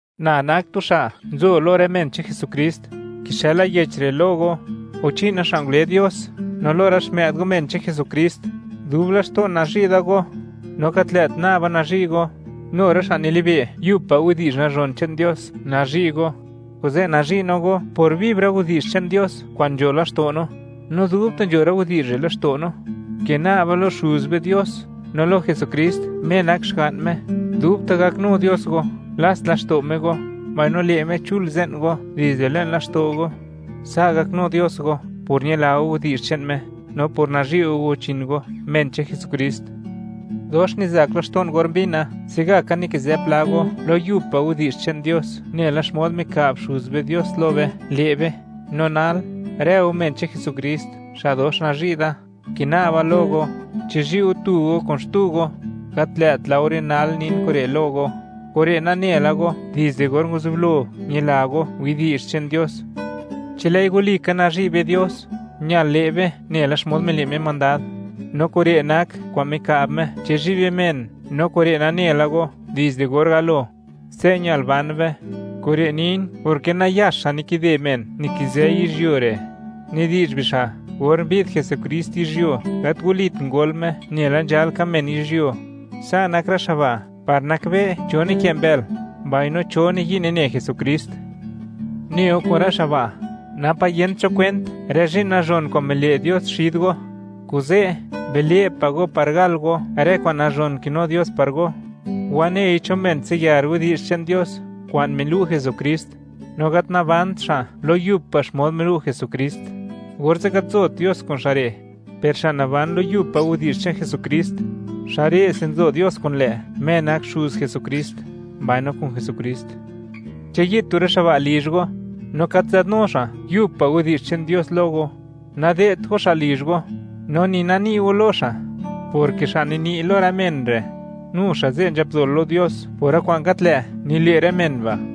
Na nak tu xa' nzo lo rë men che'n Jesukrist; kixëla yech re' lo go, guchi'na, xa' ngule Dios, no lo rë xmë'd go, men che'n Jesukrist. Dub laxto'n nazhi' da go, no gat lë't naba nazhi' go, nu rë xa' nilibe' yub pa' widi'zh nazhon che'n Dios nazhi' go. Kuze' nazhi' no go por viv rë widi'zh che'n Dios kwa'n nzho laxto' no, no dubta' nzho rë widi'zh re' laxto' no. Kina'ba lo Xuz be Dios no lo Jesukrist Me nak Xga'n Me, dubta' gaknu Dios go, lats laxto' Me go mbaino le' Me chul ze'n go dizde le'n laxto' go. Sa' gaknu Dios go por ñila go widi'zh che'n Me no por nazhi' go guchin go, men che'n Jesukrist. Dox nizak laxto'n or mbina, se'gaka nikizë pla go lo yub pa' widi'zh che'n Dios, nela xmod mika'b Xuz be Dios lo be, le' be. No nal, rë go men che'n Jesukrist, xa' dox nazhi' da; kina'ba lo go, chizhi' go tu go kun xtu go. Gat lë't laore nal nin kure' lo go; kure' nane la go dizde or nguzublo, ñila go widi'zh che'n Dios. Chi lë'i walika nazhi' be Dios, ñal le' be nela xmod mile' Me mandad, no kure' nak kwa'n mika'b Me: Chizhi' be men, no kure' nane la go dizde or galo. Se' ñal ban be. Kure' nin, porke nayax xa' nikide men nikizë yizhyuo re'; nidi'zh bixa', or mbi'd Jesukrist yizhyuo, gat walit ngol Me nela nzhal ka men yizhyuo. Sa' nak rë xa' ba' par nakbe', cho nikë' mbël mbaino cho niyi' nine Jesukrist. Ne go kun rë xa' ba', napa' yent cho kwent rë zhi'n nazhon kwa'n mile' Dios xid go. Kuze', bile' pa' go par gal go rë kwa'n nazhon kinu Dios par go. Wanei cho men tsiyar widi'zh che'n Dios kwa'n milu' Jesukrist, no gat nabant xa' lo yub pa' xmod milu' Jesukrist, orze' gat nzot Dios kun xa' re'; per xa' naban lo yub pa' widi'zh che'n Jesukrist, xa' re'se nzo Dios kun lë', Me nak Xuz Jesukrist, mbaino kun Jesukrist. Chi yi'd tu rë xa' ba' lizh go, no gat nzadnu xa' yub pa' widi'zh che'n Dios lo go, nade'dt go xa' lizh go, no ni nani' go lo xa', porke xa' nini' lo rë men re', nu xa' ze' nzhap dol lo Dios por rë kwa'n gat lë' nile' rë men ba'.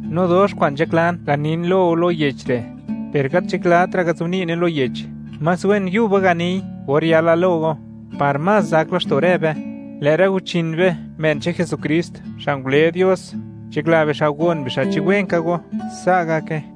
No dox kwa'n nzhaklan ganin lo go lo yech re', per gat nzhaklatra' ngazobni'ne lo yech. Más wen yuba ganiy or yala lo go, par más zak laxto' rë be. Lë' rë guchin be, men che'n Jesukrist, xa' ngule Dios, nzhakla bixa' gon bixa' chi wen ka go. Sa' gake.